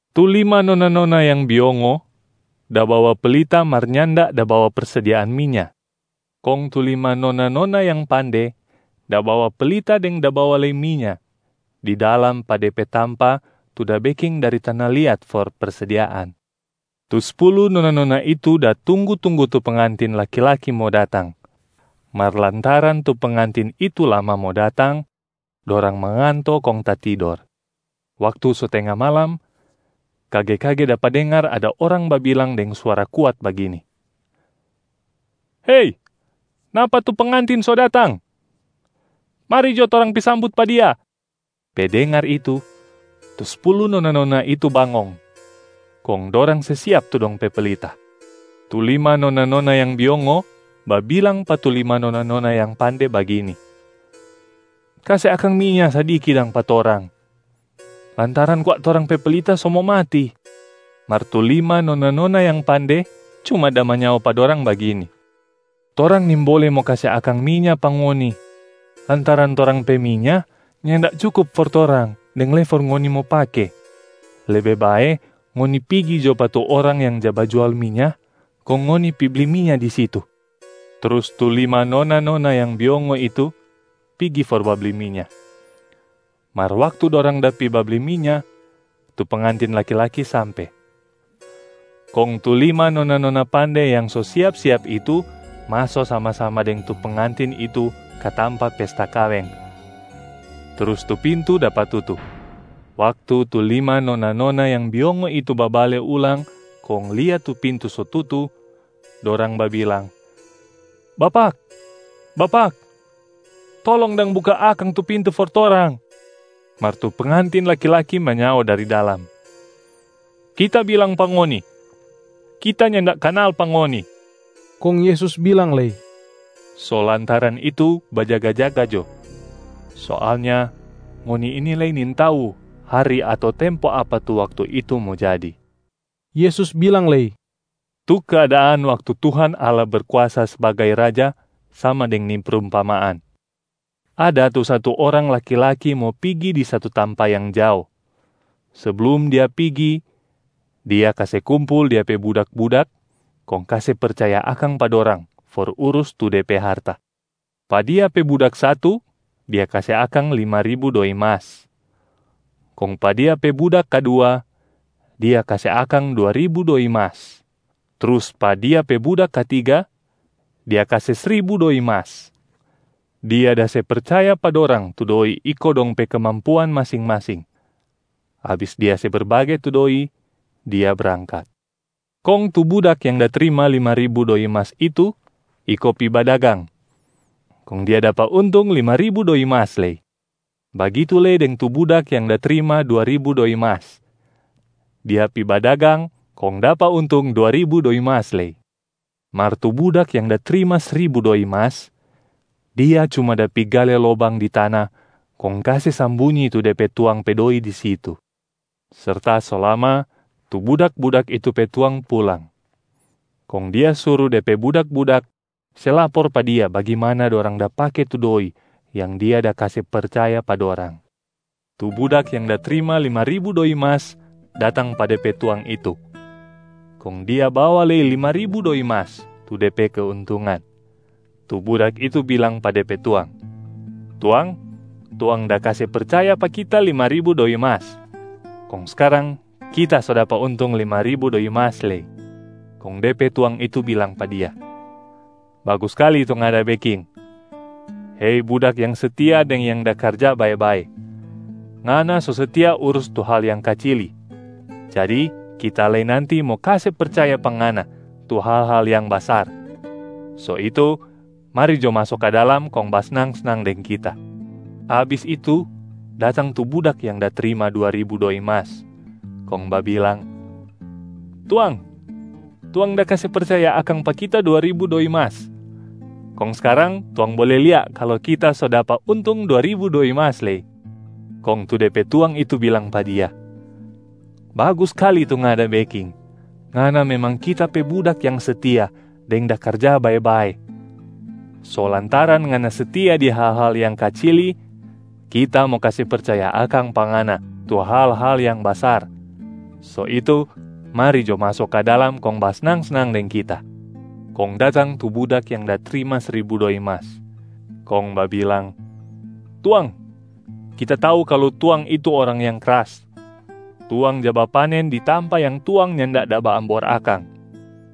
Tu lima nona-nona yang biongo da bawa pelita mar nyanda da bawa persediaan minya, kong tu lima nona-nona yang pande da bawa pelita deng da bawa lei minya di dalam pa de pe tampa tu da beking dari tana liat for persediaan. Tu spulu nona-nona itu da tunggu-tunggu tu pengantin laki-laki mo datang, mar lantaran tu pengantin itu lama mo datang, dorang manganto kong tatidor. Waktu so tenga malam, kage-kage dapa dengar ada orang babilang deng suara kuat bagini, ‘Hei, napa tu pengantin so datang! Mari jo torang pi sambut pa dia!’ Pe dengar itu, tu spulu nona-nona itu bangong, kong dorang se siap tu dong pe pelita. Tu lima nona-nona yang biongo babilang pa tu lima nona-nona yang pande bagini, ‘Kase akang minya sadiki dang pa torang, lantaran kwa torang pe pelita so mo mati.’ Mar tu lima nona-nona yang pande cuma da manyao pa dorang bagini, ‘Torang nimbole mo kase akang minya pa ngoni, lantaran torang pe minya nyanda cukup for torang deng lei for ngoni mo pake. Lebe bae ngoni pigi jo pa tu orang yang ja bajual minya kong ngoni pi bli minya di situ.’ Trus tu lima nona-nona yang biongo itu pigi for babli minya. Mar waktu dorang da pi babli minya, tu pengantin laki-laki sampe. Kong tu lima nona-nona pande yang so siap-siap itu maso sama-sama deng tu pengantin itu ka tampa pesta kaweng, trus tu pintu dapa tutu. Waktu tu lima nona-nona yang biongo itu babale ulang kong lia tu pintu so tutu, dorang babilang, ‘Bapak, Bapak, tolong dang buka akang tu pintu for torang.’ Mar tu pengantin laki-laki manyao dari dalam, ‘Kita bilang pa ngoni, Kita nyanda kanal pa ngoni.’” Kong Yesus bilang lei, “So lantaran itu bajaga-jaga jo, soalnya ngoni ini lei nintau hari ato tempo apa tu waktu itu mo jadi.” Yesus bilang lei, “Tu keadaan waktu Tuhan Allah Berkuasa sbagai Raja sama deng ni prumpamaan: ada tu satu orang laki-laki mo pigi di satu tampa yang jao. Seblum dia pigi, dia kase kumpul dia pe budak-budak kong kase percaya akang pa dorang for urus tu de pe harta. Pa dia pe budak satu, dia kase akang lima ribu doi mas.a Kong pa dia pe budak kadua, dia kase akang dua ribu doi mas. Trus pa dia pe budak katiga, dia kase sribu doi mas. Dia da se percaya pa dorang tu doi iko dong pe kemampuan masing-masing. Abis dia se berbage tu doi, dia brangkat. Kong tu budak yang da trima lima ribu doi mas itu iko pi badagang, kong dia dapa untung lima ribu doi mas lei. Bagitu lei deng tu budak yang da trima dua ribu doi mas. Dia pi badagang, kong dapa untung dua ribu doi mas lei. Mar tu budak yang da trima sribu doi mas, dia cuma da pi gale lobang di tana kong kase sambunyi tu de pe tuang pe doi di situ. Serta so lama, tu budak-budak itu pe tuang pulang. Kong dia suru de pe budak-budak se lapor pa dia bagimana dorang da pake tu doi yang dia da kase percaya pa dorang. Tu budak yang da trima lima ribu doi mas datang pa de pe tuang itu, kong dia bawa lei lima ribu doi mas tu de pe keuntungan. Tu budak itu bilang pa de pe tuang, ‘Tuang, tuang da kase percaya pa kita lima ribu doi mas, kong skarang kita so dapa untung lima ribu doi mas lei.’ Kong de pe tuang itu bilang pa dia, ‘Bagus skali tu ngana da beking, hei budak yang setia deng yang da karja bae-bae. Ngana so setia urus tu hal yang kacili, jadi kita lei nanti mo kase percaya pa ngana tu hal-hal yang basar, so itu mari jo maso ka dalam kong basnang-snang deng kita!’ Abis itu, datang tu budak yang da trima dua ribu doi mas, kong babilang, ‘Tuang, tuang da kase percaya akang pa kita dua ribu doi mas, kong skarang tuang bole lia kalu kita so dapa untung dua ribu doi mas lei.’ Kong tu de pe tuang itu bilang pa dia, ‘Bagus skali tu ngana da beking. Ngana memang kita pe budak yang setia deng da karja bae-bae. So lantaran ngana setia di hal-hal yang kacili, kita mo kase percaya akang pa ngana tu hal-hal yang basar, so itu mari jo maso ka dalam kong basnang-snang deng kita!’ Kong datang tu budak yang da trima sribu doi mas, kong babilang, ‘Tuang, kita tau kalu tuang itu orang yang kras. Tuang ja bapanen di tampa yang tuang nyanda da baambor akang,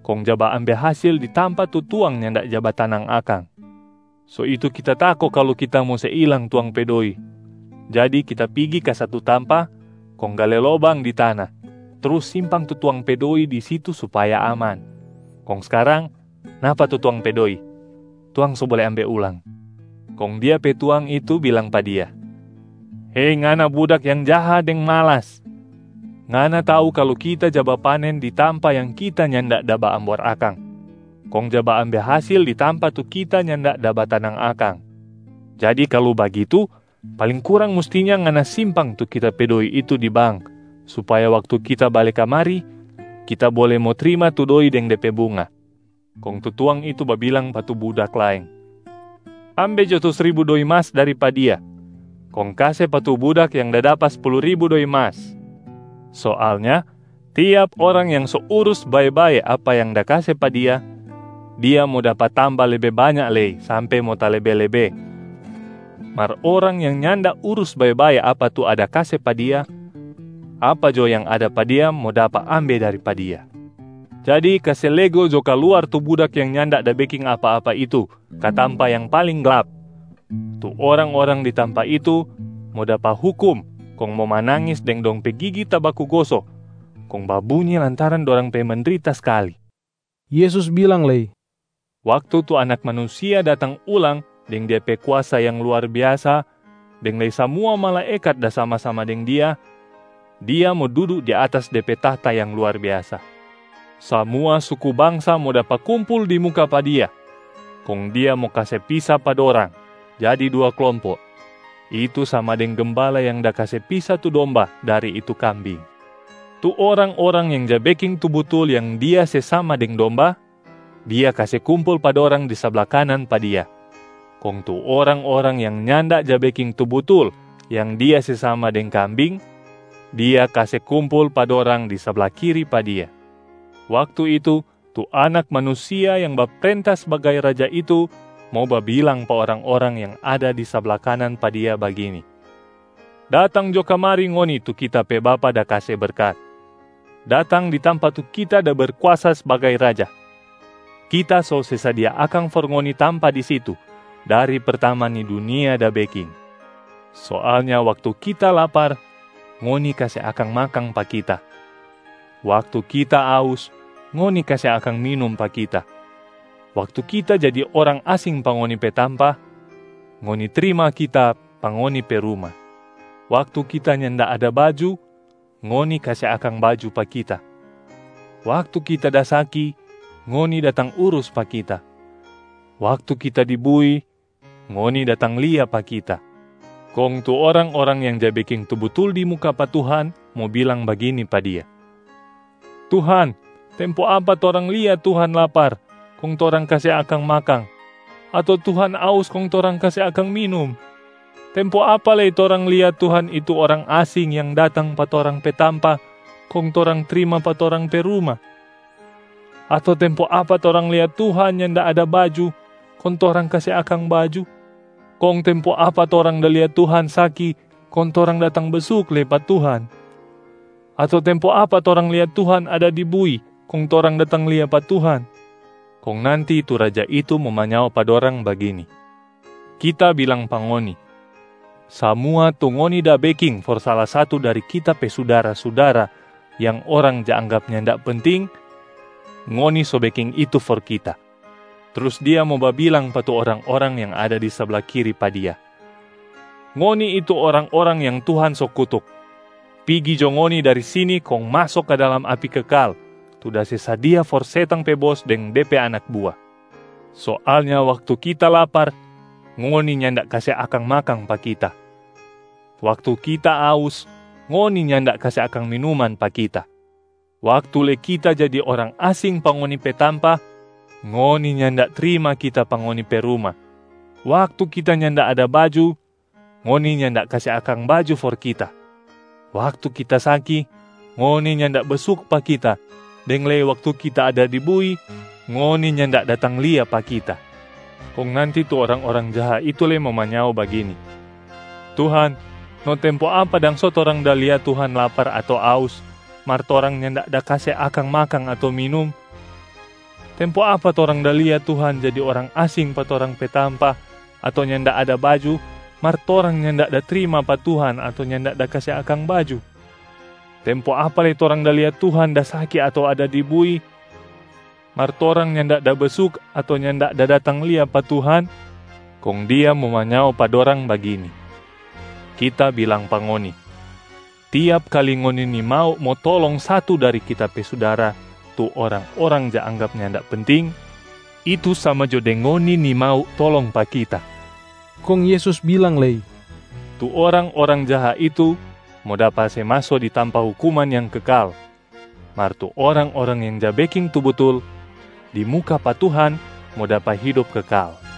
kong ja baambe hasil di tampa tu tuang nyanda ja batanang akang. So itu kita tako kalu kita mo se ilang tuang pe doi. Jadi kita pigi ka satu tampa kong gale lobang di tana trus simpang tu tuang pe doi di situ supaya aman. Kong skarang, napa tu tuang pe doi, tuang so bole ambe ulang.’ Kong dia pe tuang itu bilang pa dia, ‘Hei ngana budak yang jaha deng malas. Ngana tau kalu kita ja bapanen di tampa yang kita nyanda da baambor akang, kong ja baambe hasil di tampa tu kita nyanda da batanang akang. Jadi kalu bagitu, paling kurang mustinya ngana simpang tu kita pe doi itu di bank supaya waktu kita bale kamari, kita bole mo trima tu doi deng de pe bunga.’ Kong tu tuang itu babilang pa tu budak laeng, ‘Ambe jo tu sribu doi mas dari pa dia, kong kase pa tu budak yang da dapa spulu ribu doi mas. Soalnya tiap orang yang so urus bae-bae apa yang da kase pa dia, dia mo dapa tamba lebe banya lei sampe mo talebe-lebe. Mar orang yang nyanda urus bae-bae apa tu ada kase pa dia, apa jo yang ada pa dia mo dapa ambe dari pa dia. Jadi kase lego jo kaluar tu budak yang nyanda da beking apa-apa itu ka tampa yang paling glap. Tu orang-orang di tampa itu mo dapa hukum kong mo manangis deng dong pe gigi tabaku goso kong babunyi lantaran dorang pe mendrita skali.’” Yesus bilang lei, “Waktu tu Anak Manusia datang ulang deng Dia pe kuasa yang luar biasa, deng lei samua malaekat da sama-sama deng Dia, Dia mo dudu di atas De pe tahta yang luar biasa. Samua suku bangsa mo dapa kumpul di muka pa Dia, kong Dia mo kase pisa pa dorang jadi dua klompo, itu sama deng gembala yang da kase pisa tu domba dari tu kambing. Tu orang-orang yang ja beking tu butul yang Dia se sama deng domba, Dia kase kumpul pa dorang di sabla kanan pa Dia, kong tu orang-orang yang nyanda ja beking tu butul yang Dia se sama deng kambing, Dia kase kumpul pa dorang di sabla kiri pa Dia. Waktu itu, tu Anak Manusia yang baprenta sbagai Raja itu mo babilang pa orang-orang yang ada di sabla kanan pa Dia bagini, ‘Datang jo kamari ngoni tu Kita pe Bapa da kase berkat! Datang di tampa tu Kita da Berkuasa sbagai Raja, Kita so se sadia akang for ngoni tampa di situ dari pertama ni dunia da beking. Soalnya waktu Kita lapar, ngoni kase akang makang pa Kita. Waktu Kita aus, ngoni kase akang minum pa Kita. Waktu Kita jadi orang asing pa ngoni pe tampa, ngoni trima Kita pa ngoni pe ruma. Waktu Kita nyanda ada baju, ngoni kase akang baju pa Kita. Waktu Kita da saki, ngoni datang urus pa Kita. Waktu Kita di bui, ngoni datang lia pa Kita.’ Kong tu orang-orang yang ja beking tu butul di muka pa Tuhan mo bilang bagini pa Dia, ‘Tuhan, tempo apa torang lia Tuhan lapar kong torang kase akang makang, ato Tuhan aus kong torang kase akang minum? Tempo apa lei torang lia Tuhan itu orang asing yang datang pa torang pe tampa kong torang trima pa torang pe ruma? Ato tempo apa torang lia Tuhan nyanda ada baju kong torang kase akang baju? Kong tempo apa torang da lia Tuhan saki kong torang datang besuk lei pa Tuhan? Ato tempo apa torang lia Tuhan ada di bui kong torang datang lia pa Tuhan?’ Kong nanti tu Raja itu mo manyao pa dorang bagini, ‘Kita bilang pa ngoni, samua tu ngoni da beking for sala satu dari Kita pe sudara-sudara yang orang ja anggap nyanda penting, ngoni so beking itu for Kita.’ Trus Dia mo babilang pa tu orang-orang yang ada di sabla kiri pa Dia, ‘Ngoni itu orang-orang yang Tuhan so kutuk. Pigi jo ngoni dari sini kong maso ka dalam api kekal tu da se sadia for setang pe bos deng de pe anak bua. Soalnya waktu Kita lapar, ngoni nyanda kase akang makang pa Kita. Waktu Kita aus, ngoni nyanda kase akang minuman pa Kita. Waktu lei Kita jadi orang asing pa ngoni pe tampa, ngoni nyanda trima Kita pa ngoni pe ruma. Waktu Kita nyanda ada baju, ngoni nyanda kase akang baju for Kita. Waktu Kita saki, ngoni nyanda besuk pa Kita deng lei waktu Kita ada di bui, ngoni nyanda datang lia pa Kita.’ Kong nanti tu orang-orang jaha itu lei mo manyao bagini, ‘Tuhan, no tempo apa dang so torang da lia Tuhan lapar ato aus mar torang nyanda da kase akang makang ato minum? Tempo apa torang da lia Tuhan jadi orang asing pa torang pe tampa ato nyanda ada baju, mar torang nyanda da trima pa Tuhan ato nyanda da kase akang baju? Tempo apa lei torang da lia Tuhan da saki ato ada di bui, mar torang nyanda da besuk ato nyanda da datang lia pa Tuhan?’ Kong Dia mo manyao pa dorang bagini, ‘Kita bilang pa ngoni, tiap kali ngoni nimau mo tolong satu dari Kita pe sudara tu orang-orang ja anggap nyanda penting, itu sama jo deng ngoni nimau tolong pa Kita.’” Kong Yesus bilang lei, “Tu orang-orang jaha itu mo dapa se maso di tampa hukuman yang kekal, mar tu orang-orang yang ja beking tu butul di muka pa Tuhan mo dapa hidop kekal.”